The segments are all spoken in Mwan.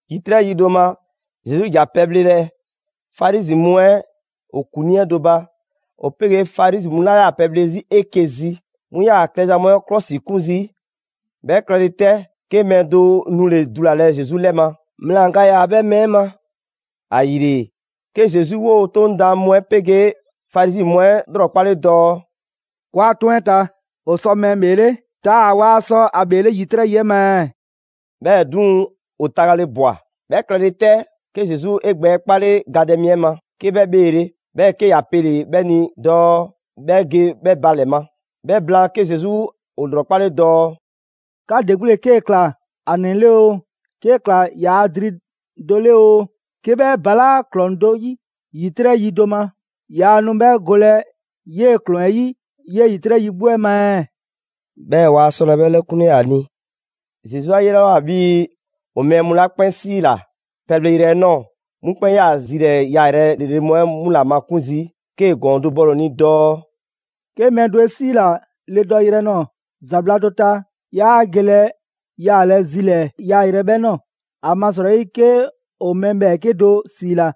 ‑Yitrɛ' yi do ma, Zesu ‑ja pɛbhlelɛ Farizi mu 'ɛ ‑o ‑kuŋlii 'ɛ do ba. ‑O 'pegee Farizi mu 'la 'yaa‑ pɛbhle 'zi 'eke‑ zi, 'mu ‑yaa ‑a klɛza mu 'ɛ 'klɔsikun zii'. 'Bhɛ klɛle 'tɛ, 'ke mɛɛ do nule‑ dulalɛ Zesu 'lɛ ma: ‑mlaan ga ‑yaa 'bhɛ mɛɛ 'ɛ ma. ‑Ayile, 'ke Zesu 'woo‑ 'Toŋ daan mu 'ɛ 'pegee Farizi mu 'ɛ 'lrɔkpale dɔɔ: «‑Kɔɔa' 'toŋ 'ɛ ta, ‑o sɔ mɛɛ ‑bheele' taa‑ waa sɔ ‑a ‑bheele' ‑yitrɛ' yi 'ɛ ma ɛɛ?» 'Bhɛɛ‑ 'duŋ‑, ‑o tagale ꞊bwa. 'Bhɛ klɛle 'tɛ, 'ke Zesu 'e gbɛ 'kpale gadɛ mi 'ɛ ma, 'ke 'bhɛ 'bheele, 'bhɛɛ‑ 'ke ‑ya pele‑ 'bhɛ ni dɔɔ 'bhɛ ge 'bhɛ ba ‑lɛ ma. 'Bhɛ blaan, 'ke Zesu ‑o ‑lrɔkpale dɔɔ: «'Ka ‑de 'gbu ‑le 'kee‑ ‑kla ‑a ‑nɛ 'le oo, 'kee‑ ‑kla ‑yaa' dri do 'le oo, 'ke 'bhɛ ‑balaa' ‑klɔŋ do ‑yi ‑yitrɛ' yi do ma, yaa nu 'bhɛ golɛ 'yee‑ ‑klɔŋ 'ɛ yi 'yee‑ ‑yitrɛ' yi 'gbu 'ɛ ma ɛɛ?» 'Bhɛɛ‑ waa 'sɔlɛ‑ 'bhɛ 'lɛkunle ‑a ni. Zesu 'a 'yelawoa 'bhii‑ ‑o mɛɛ mu 'la 'kpɛn 'siila‑ pɛleyrɛ 'ɛ ꞊nɔɔ, 'mu 'kpɛn 'yaa‑ zilɛɛ‑ yaayrɛ ‑lrele' mu 'ɛ 'mu ‑la makun' zii', 'kee‑ ‑gɔɔn dɔ bɔle‑ dɔɔ: «'Ke mɛɛ do 'e 'siila‑ le dɔyrɛ nɔɔ‑ ‑zabla' do ta, 'yaa gelɛ yaalɛ zilɛɛ‑ yaayrɛ 'ɛ 'bhɛ ꞊nɔɔ. ‑Amasrɔyi 'ke ‑o mɛɛ ‑bhɛɛke' do ‑siila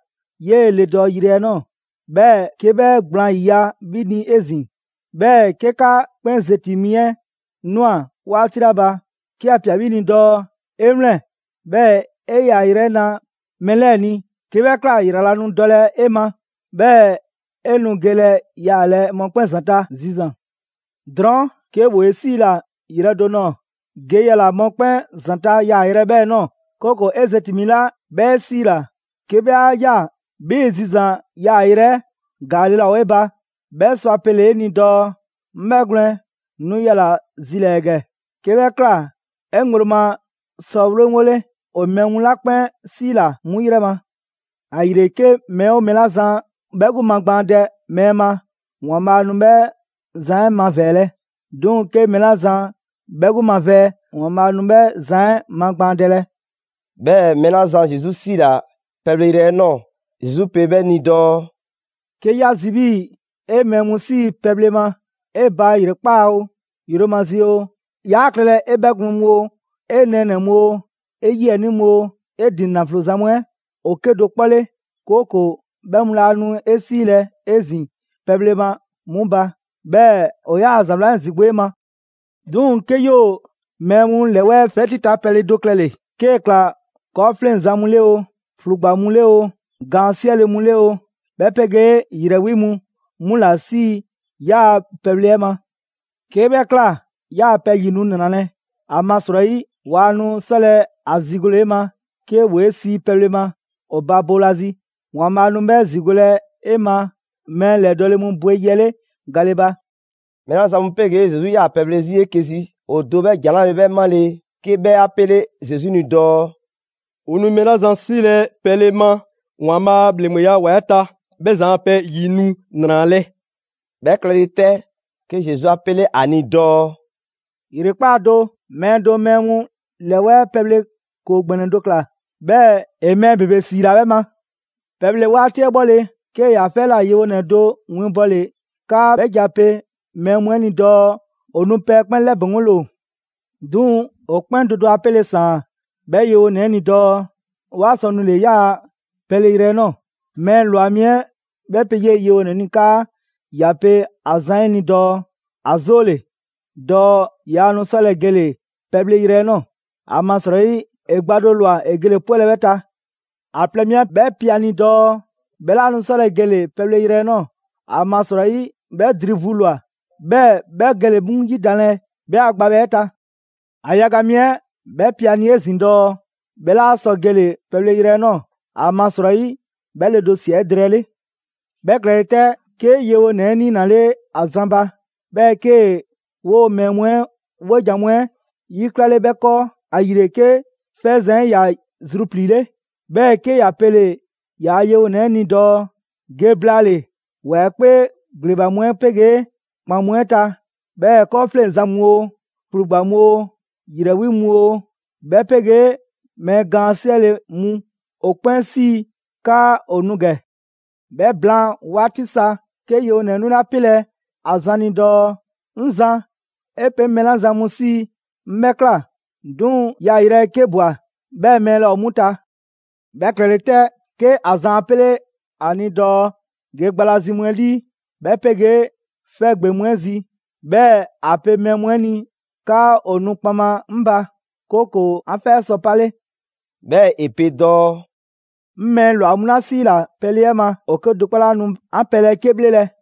'yee‑ le dɔyrɛ 'ɛ ꞊nɔɔ, 'bhɛɛ‑ 'ke 'bhɛ gblaan ‑yiya' 'bhi ni 'ezin‑, 'bhɛɛ‑ 'ke 'ka 'kpɛn zeti‑ mi 'ɛ ꞊nwa 'waati 'la ba, 'ke ‑ya ꞊pia 'bhi ni dɔɔ: ‹'E 'wlɛn‑, 'bhɛɛ‑ 'e 'yaayrɛ‑ 'ɛ 'na mɛɛ 'lɛɛ‑ ni.› 'Ke 'bhɛ ꞊kla, ‑yrala' nu dɔlɛ 'e ma, 'bhɛɛ‑ 'e nu gelɛ yaalɛ mɔkpɛn' ‑zanta' zizan‑. Drɔɔn' 'ke ‑woo 'e 'siila‑ yrɛ do ꞊nɔɔ, ge yala‑ mɔkpɛn' ‑zanta' yaayrɛ 'ɛ 'bhɛɛ‑ ꞊nɔɔ; 'kooko‑ 'e zeti‑ mi 'la 'bhɛ 'e 'siila‑, 'ke 'bhɛ 'a ꞊ya 'bhii‑ zizan‑ 'yaayrɛ‑ 'ɛ ‑gaale' laa ‑o 'e ba, 'bhɛ sɔ ‑a pele‑ 'e ni dɔɔ: ‹'Ŋ 'bhɛgwlɛn‑ nu yala‑ zilɛɛ‑ ‑gɛ!› 'Ke 'bhɛ ꞊kla, 'e ŋgblo ma sɔ 'ŋgole ‑o mɛɛ mu 'la 'kpɛn 'siila‑ 'mu 'yrɛ ma. ‑Ayile, 'ke mɛɛ 'oo mɛɛ 'la zan 'bhɛ 'gbu magbaandɛ mɛɛ ma, ‑Waanbhaa' nu 'bhɛ zan 'ɛ mavɛɛlɛ, 'duŋ‑ 'ke mɛɛ 'la zan 'bhɛ 'gbu mavɛɛ, ‑Waanbhaa' nu 'bhɛ zan 'ɛ magbaandɛlɛ.» 'Bhɛɛ‑ mɛɛ 'la zan Zesu 'siila‑ pɛbhleyrɛ 'ɛ nɔɔ‑, Zesu pe 'bhɛ ni dɔɔ: «'Ke 'ya zi 'bhii‑ 'e mɛɛ mu 'sii‑ pɛbhle ma 'e ba ‑yrekpaa' oo, yromazi oo, yaa klɛlɛ 'e 'bhɛgwlɛn‑ mu oo, 'e nɛɛnɛ‑ mu oo, 'e 'yiɛnii mu oo, 'e ‑din ‑naflo zan mu 'ɛ ‑o 'kedo‑ 'kpɔ 'le; 'kooko‑ 'bhɛ mu laa nu 'e 'siilɛ‑ 'ezin‑ pɛbhle ma 'mu ba, 'bhɛɛ‑ ‑o 'yaa‑ ‑za 'wlan 'ɛ ‑zigo' 'ɛ ma. 'Duŋ‑ 'kee 'yoo‑ mɛɛ mu ‑lɛwɛɛ' 'fɛti ta pɛle do klɛle‑, 'kee‑ ꞊kla 'kɔɔfleŋzan mu 'le oo, ‑flugba mu 'le oo, gaan 'siɛle‑ mu 'le oo, 'bhɛ 'pegee ‑yrɛ 'wi mu, 'mu ‑la 'sii‑ 'yaa‑ pɛbhle 'ɛ ma. 'Kee 'bhɛ ꞊kla, 'yaa‑ pɛ ‑yi nu ‑nralɛ', ‑amasrɔyi waa nu 'sɔlɛ‑ ‑a ‑zigole 'e ma 'ke ‑woo 'e sii pɛbhle ma ‑o ba boolazi. ‑Waanbhaa' nu 'bhɛ ‑zigolɛ 'e ma mɛɛ ‑lɛdɔɔle mu bwe yi 'ɛ 'le gale ba.» Mɛɛ 'la zan mu 'pegee Zesu 'yaa‑ pɛbhle 'zi 'eke‑ zi, ‑o do 'bhɛ ‑jan 'la bhe 'bhɛ 'male‑, 'ke 'bhɛ 'a 'pele Zesu ni dɔɔ: «‑O nu mɛɛ 'la zan 'siilɛ‑ pɛle ma ‑Waanbhaa' a ‑bhleŋgbeya ‑wa 'ɛ ta, 'bhɛ zan a pɛ ‑yi nu ‑nralɛ'.» 'Bhɛ klɛle 'tɛ, 'ke Zesu 'a 'pele ‑a ni dɔɔ: «‑Yrekpaa' do mɛɛ do mɛɛ mu ‑lɛwɛɛ' pɛbhle ‑koo ‑gbɛnɛ do ‑kla, 'bhɛɛ‑ ‑e mɛɛ ‑bebe ‑siila 'bhɛ ma. Pɛbhle 'waati 'ɛ 'bhɔle‑, 'kee‑ yaa 'fɛ 'ɛ ꞊la yewonɛ 'ɛ do winbɔle 'kaa 'bhɛ ge a pe mɛɛ mu 'ɛ ni dɔɔ ‑o nu, pɛ 'ɛ 'kpɛn 'lɛbɛŋgole ‑o. 'Duŋ‑, ‑o 'kpɛn do do a 'pele‑ ‑saan 'bhɛ yewonɛ 'ɛ ni dɔɔ waa sɔ nule‑ ‑yaa' pɛleyrɛ 'ɛ ꞊nɔɔ. Mɛɛ ‑lwa mi 'ɛ 'bhɛ pe 'yee‑ yewonɛ 'ɛ ni 'kaa ‑ya pe ‑a zan 'ɛ ni dɔɔ: ‑A 'zoole‑, dɔɔ yaa nu 'sɔlɛ‑ gele‑ pɛbhleyrɛ 'ɛ ꞊nɔɔ, ‑amasrɔyi ‑e gba do ‑lwa ‑e gele‑ 'pwɛlɛ‑ 'bhɛ ta. ‑A plɛ mi 'ɛ 'bhɛ pe ‑a ni dɔɔ, 'bhɛ 'laa nu 'sɔlɛ‑ gele‑ pɛbhleyrɛ 'ɛ ꞊nɔɔ, ‑amasrɔyi 'bhɛ dri vu ‑lwa, 'bhɛɛ 'bhɛ gele‑ 'mu ‑yidanlɛ 'bhɛ a gbabhɛ 'ɛ ta. ‑A yaga mi 'ɛ 'bhɛ pe a ni 'ezin‑ dɔɔ 'bhɛ 'laa sɔ gele‑ pɛbhleyrɛ 'ɛ ꞊nɔɔ, ‑amasrɔyi 'bhɛ le do ꞊sia 'edrɛɛle. 'Bhɛ klɛle 'tɛ, 'ke yewonɛ 'ɛ 'niinale ‑a zan ba, 'bhɛɛ‑ 'kee‑ 'woo‑ mɛɛ mu 'ɛ 'wojan‑ mu 'ɛ 'yiklale 'bhɛ 'kɔɔ. ‑Ayile 'ke 'fɛzan‑ 'ɛ ‑ya zrupliile', 'bhɛɛ‑ 'ke ‑ya pele‑ ‑yaa' yewonɛ 'ɛ ni dɔɔ: ‹Ge blaale‑ ‑wa 'ɛ 'kpee ‑gbleba mu 'ɛ 'pegee ‑kpan mu 'ɛ ta, 'bhɛɛ 'kɔɔfleŋzan mu oo, ‑flugba mu oo, ‑yrɛ 'wi mu oo, 'bhɛ 'pegee mɛɛ gaan 'siɛle‑ mu, ‑o 'kpɛn 'sii 'kaa ‑o nu ‑gɛ.› 'Bhɛ blaan 'waati sa, 'ke yewonɛ 'ɛ 'nule ‑a pelɛ ‑a zan ni dɔɔ: ‹'Ŋ Zan, 'e pe 'ŋ mɛɛ 'la zan mu 'sii‑ 'ŋ 'bhɛ ꞊kla, 'duŋ‑ yaayrɛ 'ɛ 'ke ꞊bwa, 'bhɛɛ‑ mɛɛ laa ‑o 'mu ta.› 'Bhɛ klɛle 'tɛ, 'ke ‑a zan 'a pele‑ 'a ni dɔɔ: ‹Ge gba la zi mu 'ɛ 'lii, 'bhɛ 'pegee 'fɛ ‑gbeŋ mu 'ɛ zi, 'bhɛɛ‑ ‑a pe mɛɛ nu 'ɛ ni 'kaa ‑o nu kpaŋma 'ŋ ba, 'kooko‑ 'an 'fɛ sɔ 'pale.›» 'Bhɛɛ‑ ‑e pe dɔɔ: «'Ŋ mɛɛ ‑lwa mu 'la 'siila‑ pɛle 'ɛ ma, ‑o 'kedo‑ 'kpɔ laa nu 'an pɛ 'ɛ 'ke 'bhlelɛ.»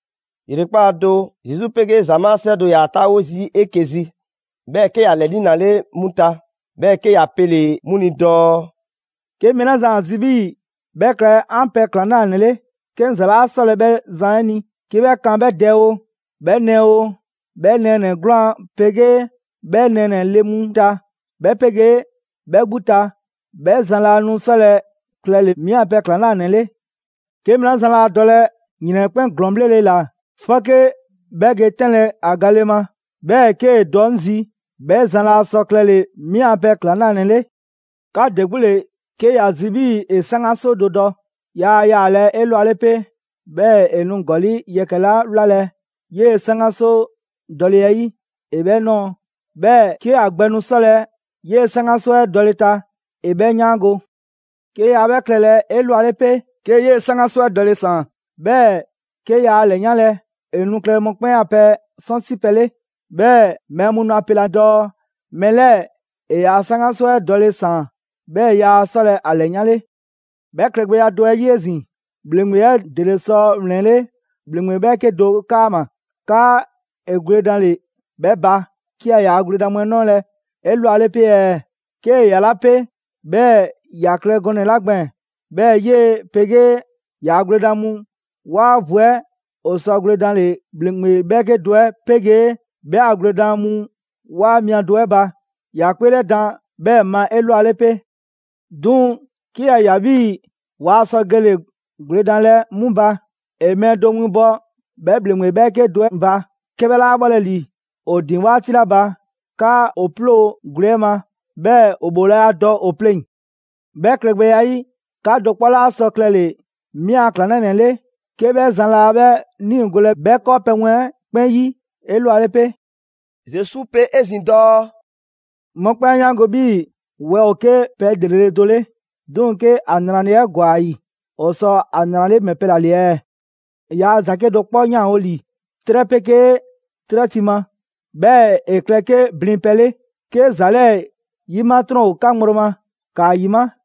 ‑Yrekpaa' do, Zesu 'pegee ‑zamaa' 'srɛ do ‑yaa 'taawo zii' 'eke‑ zi. 'Bhɛɛ‑ 'ke ‑ya ‑lɛ 'niinale 'mu ta, 'bhɛɛ‑ 'ke ‑ya pele‑ 'mu ni dɔɔ: «'Ke mɛɛ 'la zan ‑a zi 'bhii‑ 'bhɛ klɛ 'an pɛ ‑klaŋlanɛ 'le, 'ke 'ŋ ‑za 'laa 'sɔlɛ‑ 'bhɛ zan 'ɛ ni 'ke 'bhɛ kan 'bhɛ dɛ oo, 'bhɛ nɛɛ oo, 'bhɛ nɛɛnɛ‑ 'gwlaan‑ 'pegee 'bhɛ nɛɛnɛ‑ le mu ta, 'bhɛ 'pegee 'bhɛ 'gbu ta; 'bhɛ zan laa nu 'sɔlɛ‑ klɛle‑ 'mi 'an pɛ ‑klaŋlanɛ 'le. 'Ke mɛɛ 'la zan laa dɔlɛ ‑yrɛn 'ɛ 'kpɛn ‑glɔɔn 'bhlele‑ ‑la 'fɔke 'bhɛ ge 'tɛnlɛ‑ ‑a gale ma, 'bhɛɛ 'kee‑ dɔ 'ŋ zi, 'bhɛ zan laa sɔ klɛle‑ 'mi a pɛ ‑klaŋlanɛ 'le. 'Ka ‑de 'gbu ‑le 'ke ‑ya zi 'bhii‑ ‑e 'saŋgaso do dɔ, yaa yalaa' 'elwale 'pe, 'bhɛɛ‑ ‑e nu ‑gɔli' yɛkɛ‑ 'la 'wlalɛ‑ 'yee‑ 'saŋgaso dɔle 'ɛ 'yi, ‑e 'bhɛ nɔɔ. 'Bhɛɛ‑ 'kee‑ ‑a gbɛ nu 'sɔlɛ‑ 'yee‑ 'saŋgaso 'ɛ dɔle‑ ta ‑e 'bhɛ 'yaango‑. 'Ke yaa 'bhɛ klɛlɛ 'elwale 'pe, 'kee‑ 'yee‑ 'saŋgaso 'ɛ dɔle‑ ‑saan, 'bhɛɛ‑ 'ke yaa ‑a ‑lɛyanlɛ, ‑e nu klɛlɛ mɔkpɛn' a pɛ 'sɔnsipɛ 'le. 'Bhɛɛ‑ mɛɛ mu nu ‑a pelɛ dɔɔ: ‹Mɛɛ 'lɛɛ‑ ‑e ‑yaa' 'saŋgaso 'ɛ dɔle ‑saan, 'bhɛɛ‑ yaa 'sɔlɛ‑ ‑a ‑lɛyanle.› 'Bhɛ klɛgbɛya do 'ɛ 'yi 'ezin‑, ‑bhleŋgbe 'ɛ ‑dele sɔ ‑wlɛnle' ‑bhleŋgbe 'bhɛɛke do 'kaama‑ 'kaa ‑e gwledanle 'bhɛ ba, 'ke yaa ‑yaa' gwledan mu 'ɛ 'nɔɔlɛ‑ 'elwale 'pe ɛɛ? 'Kee‑ ‑yalaa' 'pe, 'bhɛɛ‑ ‑ya klɛ gɔnɛ‑ 'la gbɛɛn‑ 'bhɛɛ‑ 'yee‑ 'pegee ‑yaa' gwledan mu 'waa vu 'ɛ ‑o sɔ gwledanle ‑bhleŋgbe 'bhɛɛke do 'ɛ 'pegee 'bhɛ a gwledan mu 'waa mia do 'ɛ ba, ‑ya 'kpeelɛdan 'bhɛɛ‑ ma 'elwale 'pe. 'Duŋ‑ 'ke ‑ya ꞊ya 'bhii‑ waa sɔ gele‑ gwledanlɛ 'mu ba, ‑e mɛɛ do winbɔ 'bhɛ ‑bhleŋgbe 'bhɛɛke do 'ɛ ba, 'ke 'bhɛ 'laa 'bhɔlɛ‑ ‑li ‑o ‑din 'waati 'la ba, 'kaa ‑o 'ploo‑ gwle 'ɛ ma, 'bhɛɛ ‑o ‑bhoolaya dɔ ‑o pleŋ‑. 'Bhɛ klɛgbɛya 'ɛ 'yi, 'ka do 'kpɔ 'laa sɔ klɛle‑ 'mi a ‑klaŋlanɛ 'le 'ke 'bhɛ zan laa 'bhɛ 'niigolɛ 'bhɛ 'kɔɔpɛ‑ mu 'ɛ 'kpɛn 'yi 'elwale 'pe.» Zesu pe 'ezin‑ dɔɔ: «Mɔkpɛn' 'a 'yaango‑ 'bhii‑ wɛ ‑o 'ke pɛ ‑lrele' do 'le. 'Duŋ‑ 'ke ‑a ‑nraleya 'ɛ ‑gwa ‑a ‑yi, ‑o sɔ ‑a ‑nrale' ‑mɛ pɛ ‑la ‑le ɛɛ? Yaa ‑za 'kedo‑ 'kpɔ 'yanwo‑ ‑li 'trɛ 'pegee 'trɛ ti ma. 'Bhɛɛ‑ ‑e klɛ 'ke blin pɛ 'le. 'Ke ‑za 'lɛɛ‑ 'yima 'trɔn ‑o 'ka ŋgblo ma, ‑kaa ‑yima'!»